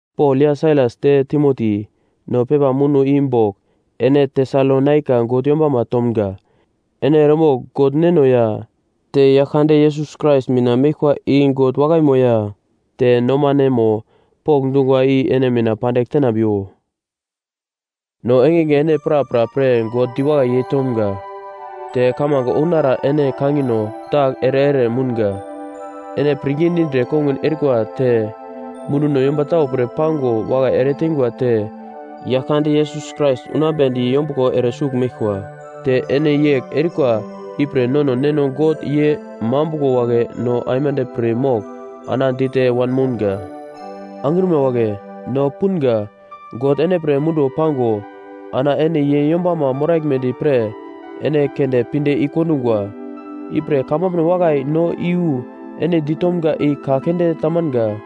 Pol ya Sailas te Timoti, no pepa muno i bogl ene Tesalonaika God yombama tomga. Ene eremogl God Neno ya te Yaglkande Yesus Krais mina meglkwa i God wakaimo ya te nomanemo pokndungwa i ene mina pandigl tenambiwo. No engenge ene prapra pre God diwakai yeitomga. Te kamange ounara ene kangino dagl ere ere mounga. Ene pirngi dindre kongun erikwa te munduno yomba tau pre pango wakai eretengwa te Yaglkande Yesus Krais unambedi yombuglo ere sugl meglkwa. Te ene yegl erikwa ipre nono neno God ye mambuglo wagle no aimande pir mogl ana dite wanmounga. Angrima wagle, no punga, God ene pre munduwo pango, ana ene ye yombama moraglmedi pre ene keunde pinde i-kondungwa. Ipre kamambuno wakai no iyu ene ditomga i ka keunde tamanga,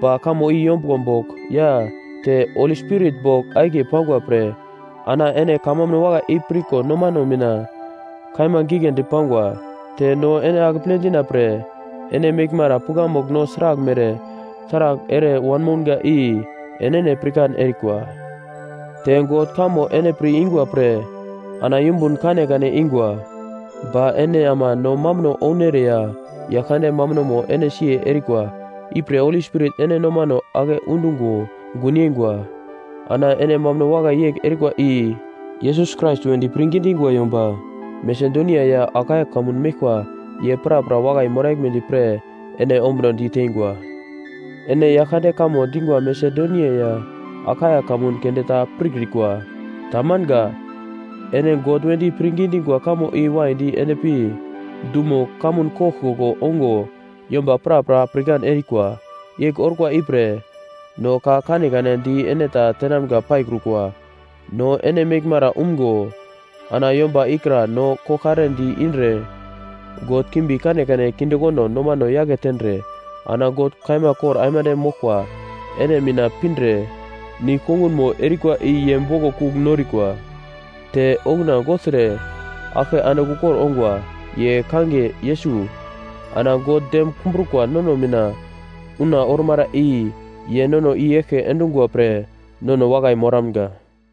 ba kamo i yombuglo bogl ya te Holi Spirit bogl akiye pangwa pre, ana ene kamambuno wakai i pirko nomano mina kaima giglendi pangwa. Te no ene akeple dina pre ene meglmara pukamugl no sraglmere taragl ere wanmounga i enene pirkan erikwa. Te God kamo ene pir ingwa pre ana yumbun kanekane ingwa. Ba ene ama no mambuno ounere ya Yaglkande mambunomo ene siye erikwa. Ipre Holi Spirit ene nomano ake undungo gun yeingwa. Ana ene mambuno wakai yegl erikwa i Yesus Krais wedi pirngi dingwa yomba Masedonia ya Akaia kamun meglkwa ye prapra wakai moraglkwa pre ene ombunodi teingwa. Ene Yaglkande kamo dingwa Masedonia ya Akaia kamun keunde ta pirkrikwa. Tamanga. Ene God wedi pirngi dingwa kamo i waidi endpi dumo kamun koglkoglo ongo yomba prapra pirkan erikwa. Yegl orkwa ipre no ka kanekane di ene ta tenamga paikrukwa. No ene meglmara umgo ana yomba ikra no koglkare di-indre god kimbi kanekane kindekondo nomano yake tendre, ana God kaima kor aimande moglkwa ene mina pindre nigl-kongunmo erikwa i ye boglo kugl norikwa. Te okuna gogltre aglke andigl ukor ongwa. Ye kangiye Yesus. Ana God dem kumbrukwa nono mina una ormara i ye nono i-eglke endungwa pre nono wakai moramga.